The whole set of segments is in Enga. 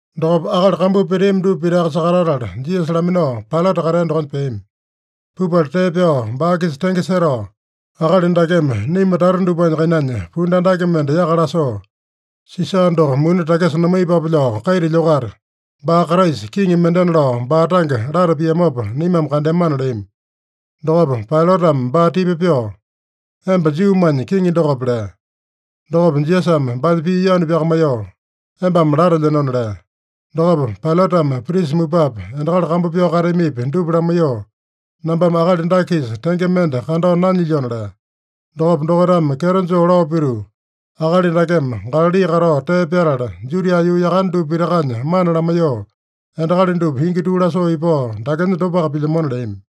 Dokopa akali kambuu peteami dupa pitaka sakatatala, Jisasa laminao Pailata katea dokonya peami. Pupala tee pyao baa-kisa tenge setao, “Akali dakeme naima tata dupanya kainanya pundu andake mende yaka lasoo, Sisa doko muni takisa namaiyepape lao kaita lyokata, baa Kraisa, kiŋi mendena lao baa tange lata piamopa naimame kandeamana” leami. Dokopa Pailatame baa tipa pyoo, “Emba Juumanya Kiŋi dokope?” lea. Dokopa Jisasame baanya pii yanu pyakamaiyoo, “Embame latelyenona” lea. Dokopa Pailatame prisa mupapi, endakali kambu pyao kateamipi, dupa lamaiyoo, “Nambame akali dake-kisa tenge mende kandao nanyilyona” lea. Dokopa dokaitame kyeto joo lao pituu, “Akali dakeme Galali katao tee pyatala, Judia yuu yakane dupa pitakanya mana lamaiyoo, endakali dupa ingi tuu lasoo ipao, dakenya dopaka pilyamona” leami.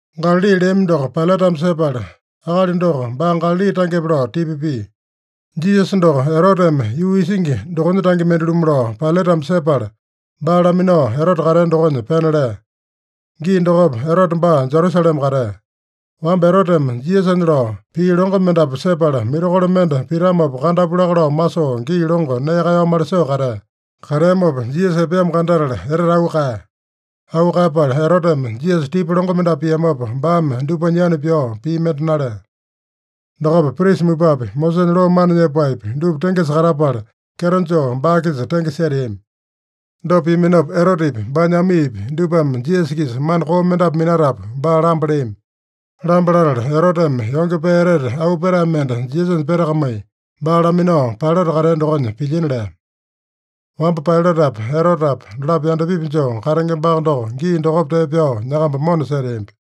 Galali leami doko Pailatame sepala, akali doko baa Galali tangepe lao tipa pia. Jisasa doko Eroteme yuu isingi dokonya tange mende-lumu lao Pailatame sepala, baa laminao Erote katea dokonya pena lea. Gii dokopa Erote baa Jerusalema katea. Wamba Eroteme Jisasanya lao pii longo mendapu sepala, mirakolo mende pitamopa kandapu laka lao masoo, gii longo nee kaeyao malisoo katea. Kateamopa, Jisasa epeamo kandatala etete auu kaeya. Auu kaeyapala Eroteme Jisasa tipa longo mendapu piamopa, baame dupanya yanu pyao pii mende nalea. Dokopa prisa mupapi, Mosesanya loo mana nyepaepi, dupa tengesa katapala, kyeto joo baa-kisa tenge seteami. Dopa piaminopa Erotepi, baanya amiipi dupame Jisasa-kisa mana koo mendapu minatapu, baa lamba leami. Lamba latala, Eroteme yonge pee etete auu petae mende Jisasanya petakamai, baa laminao Pailata katea dokonya pilyina lea. Wamba Pailatapa, Erotepa dolapo yandapipi joo katengembaka doko, gii dokopa tee pyao nyakamba mona seteambi.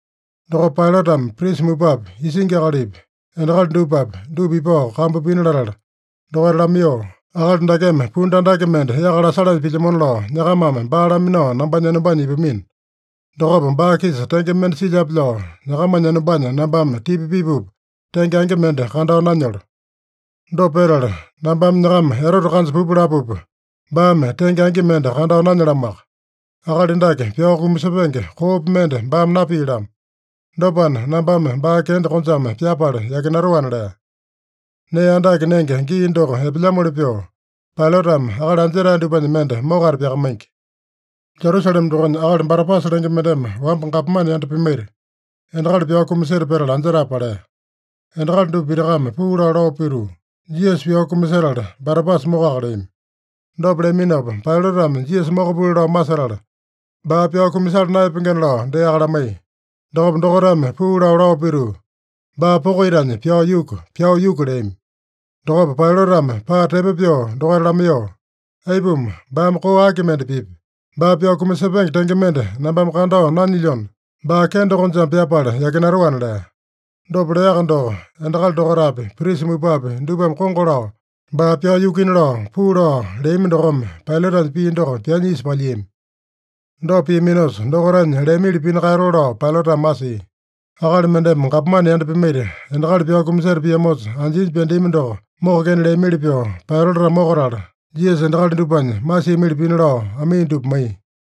Dokopa Pailatame prisa mupapi, isingi akalipi, endakali dupapi, dupa ipao kambu pina latala dokaita lamaiyoo, “Akali dakeme pundu andake mende yaka lasalanya pilyamona lao nyakamame baa laminao nambanya enombanya ipamino. Dokopa baa-kisa tenge mende silyape lao nyakamanya enombanya nambame tipa pipupa, tenge angi mende kandao nanyolo. Dopa petala, nambame nyakama Erote kanja pupa lapupa, baame tenge angi mende kandao nanyalamoaka. Akali dake pyao kumasepenge koopi mende baame napia-lamo. Dopana, nambame baa kende konjame pyapala yakinatoana” lea. Nee andake nenge gii doko epelyamoli pyoo, Pailatame akali anjetae dupanya mende mokata pyakamaingi. Jerusalema dokonya akali Barabasa lenge mendeme wamba gapomane yanda pimaita, endakali pyao kumaseta petala anjetae palea. Endakali dupa pitakame puu lao, lao pituu, “Jisasa pyao kumasetala, Barabasa mokoka” leami. Dopa leaminopa Pailatame Jisasa mokapuli lao masetala, baa pyao kumasala naeyapengena lao deaka lamaiya. Dokopa dokaitame puu lao, lao pituu, “Baa poko itanya pyao yuku! Pyao yuku!” leami. Dokopa Pailatame paa tepo pyoo dokaita lamaiyoo, “Aipuma? Baame koo aki mende pipya? Baa pyao kumasepenge tenge mende nambame kandao nanyilyona, baa kende konjame pyapala yakinatoana” lea. Dopa leaka doko, endakali dokaitapi, prisa mupapi dupame kongo lao, baa pyao yukuina lao, puu lao leami dokome, Pailatanya pii doko pyaanya isa palyiami. Dopa piaminosa, dokaitanya leamili pina kaeyatoo lao Pailatame masia. Akali mendeme gapomane yanda pimaita, endakali pyao kumaseta piamosa anjinya pyandeami doko mokokena leamili pyoo Pailatame mokatala, Jisasa endakali dupanya masiamili pina lao amii dupa maiya.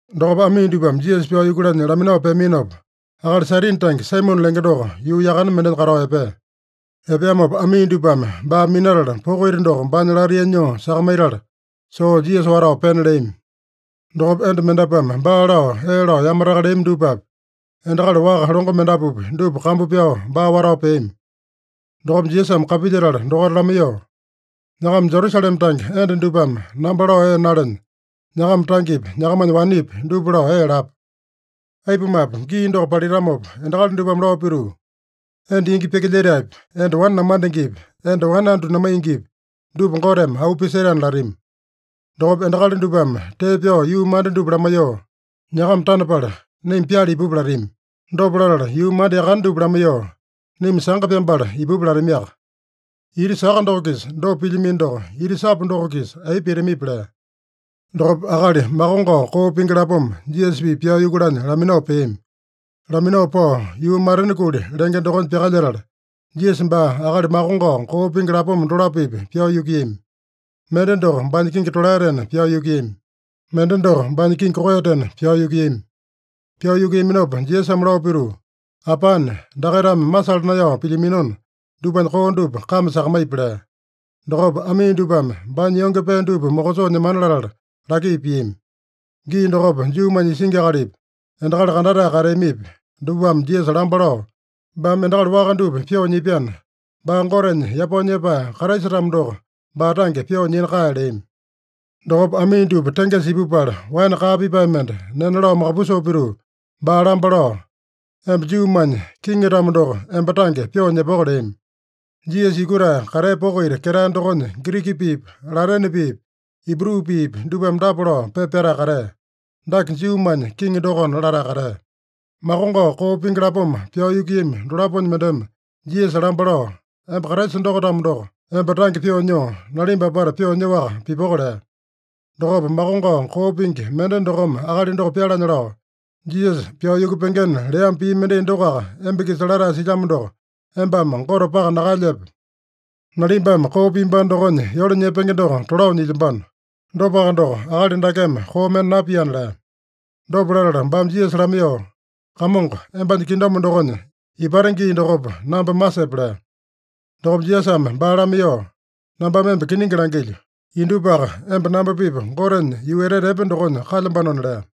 Dokopa amii dupame Jisasa pyao yukulanya laminao peaminopa, akali Sairini tange Saimone lenge doko yuu yakane mendenya katao epea. Epeamopa amii dupame baa minatala, poko ita doko baanya latainya nyoo sakamaitala, soo Jisasa watao pena leami. Dokopa enda mendapuame baa lao ee lao yamataka leami dupapi, endakali waka longo mendapupi, dupa kambu pyao baa watao peami. Dokopa Jisasame kapilyetala dokaita lamaiyoo, “Nyakama Jerusalema tange enda dupame namba lao ee nalenya, nyakama tangepi, nyakamanya wanepi dupa lao ee lapa. Aipumape, gii doko palitamopa endakali dupame lao pituu, ‘Enda ingi pyakilyetaepi, enda wane namandengepi, enda wane andu namaingipi, dupa Goteme auu pisetaena’ latami. Dokopa endakali dupame tee pyao yuu manda dupa lamaiyoo, ‘Nyakama tanapala naima pyala ipupa’ latami. Dopa latala, yuu manda yakane dupa lamaiyoo, ‘Naima sanga pyambala ipupa’ latamiaka. Ita saka doko-kisa dopa pilyamino doko, ita sapu doko-kisa aipa pitamipi?” lea. Dokopa akali makongao koo pingi lapoma, Jisasa-pipa pyao yukulanya laminao peami. Laminao pao yuu Matena Kuli lenge dokonya pyakalyetala, Jisasa baa akali makongao koo pingi lapoma dolapo-pipa pyao yukuiyami. Mende doko baanya kingi tolaetena pyao yukuiyami. Mende doko baanya kingi koeyatena pyao yukuiyami. Pyao yukuiyaminopa Jisasame lao pituu, “Apane, dakaitame masala naeyao pilyaminona, dupanya koo dupa kame sakamaipi” lea. Dokopa amii dupame baanya yonge pee dupa mokosoo nyemana latala laki piami. Gii dokopa, Juumanya isingi akalipi, endakali kandatae kateamipi, dupame Jisasa lamba lao, “Baame endakali waka dupa pyoo nyipyana, baa Gotenya yapao nyepae Kraisa-tamo doko, baa tange pyoo nyina kae” leami. Dokopa amii dupa tengesa ipupala, waene kaa pipae mende nena lao makapusoo pituu, baa lamba lao, “Emba Juumanya kiŋi-tamo doko, emba tange pyoo nyepoko” leami. Jisasa yukutae katea poko ita ketae dokonya, Giriki piipi, Latene piipi, Ibru piipi dupame dapa lao pepa pyatae katea: “Dake Juumanya kiŋi dokona” latae katea. Makongao koo pingi lapoma pyao yukuiyami dolaponya mendeme Jisasa lamba lao, “Emba Kraisa doko-tamo doko, emba tange pyoo nyoo, nalimba apata pyoo nyoaka pipoko” lea. Dokopa makongao koo pingi mende dokome akali doko pyalanya lao, “Jisasa pyao yukupengena leamo pii mendai dokoaka emba-kisa latae silyamo doko, embame Gote paka nakaelyepe? Nalimbame koo piambano dokonya yole nyepenge doko tolao nyilyambano. Dopaka doko, akali dakeme koo mende napiana” lea. Dopa latala baame Jisasa lamaiyoo, “Kamongo, embanya kingdom dokonya ipate gii dokopa namba masepe” lea. Dokopa Jisasame baa lamaiyoo, “Nambame emba kiningi langilyo: Indupaka emba namba-pipa Gotenya yuu etete epe dokonya kalyambanona” lea.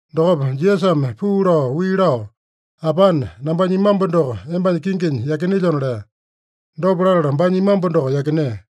Dokopa Jisasame puu lao wii lao, “Apane, nambanya imambu doko embanya kinginya yakinelyona” lea. Dopa latala baanya imambu doko yakinea.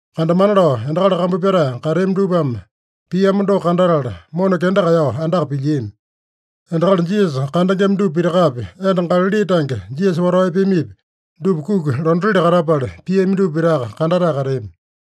Kandamana lao endakali kambu pyatae kateami dupame piamo doko kandatala, mona kenda kaeyao andaka pilyiami. Endakali Jisasa kandengema dupa pitakapi, enda Galali tange Jisasa watao epeamipi, dupa kuki londatili katapala, piami dupa pitaka kandatae kateami.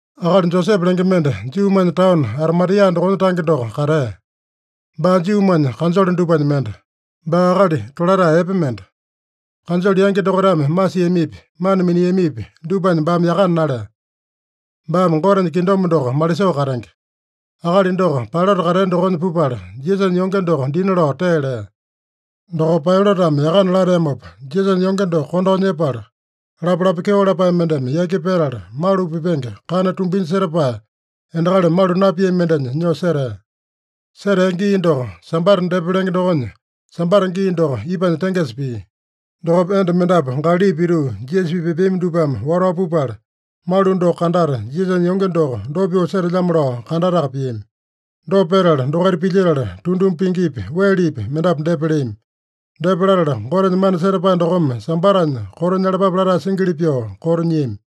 Akali Josepe lenge mende, Juumanya taono Arimatia dokonya tange doko katea. Baa Juumanya kanjole dupanya mende. Baa akali tolatae epe mende. Kanjole yangi dokaitame masiamipi, mana miniamipi dupanya baame yakana nalea. Baame Gotenya kingdom doko malisoo katenge. Akali doko Pailata katea dokonya pupala, Jisasanya yonge doko dina lao tee lea. Dokopa Pailatame yakana lateamopa, Jisasanya yonge doko kondao nyepala, lapalapa kyeo lapae mendeme yaki petala, malu pipenge kana tumbinya setapae, endakali malu napiami mendenya nyoo setea. Setea gii doko, Sambata depa lenge dokonya, Sambata gii doko ipanya tengesa pia. Dokopa enda mendapu Galali pituu, Jisasa-pipa epeami dupame watao pupala, malu doko kandata, Jisasanya yonge doko dopa pyoo setelyamo lao kandataka piami. Dopa petala dokaita pilyetala, tunduma pingipi, welepi mendapu depa leami. Depa latala, Gotenya mana setapae dokome Sambatanya koto nyalapape latae singili pyoo koto nyiami.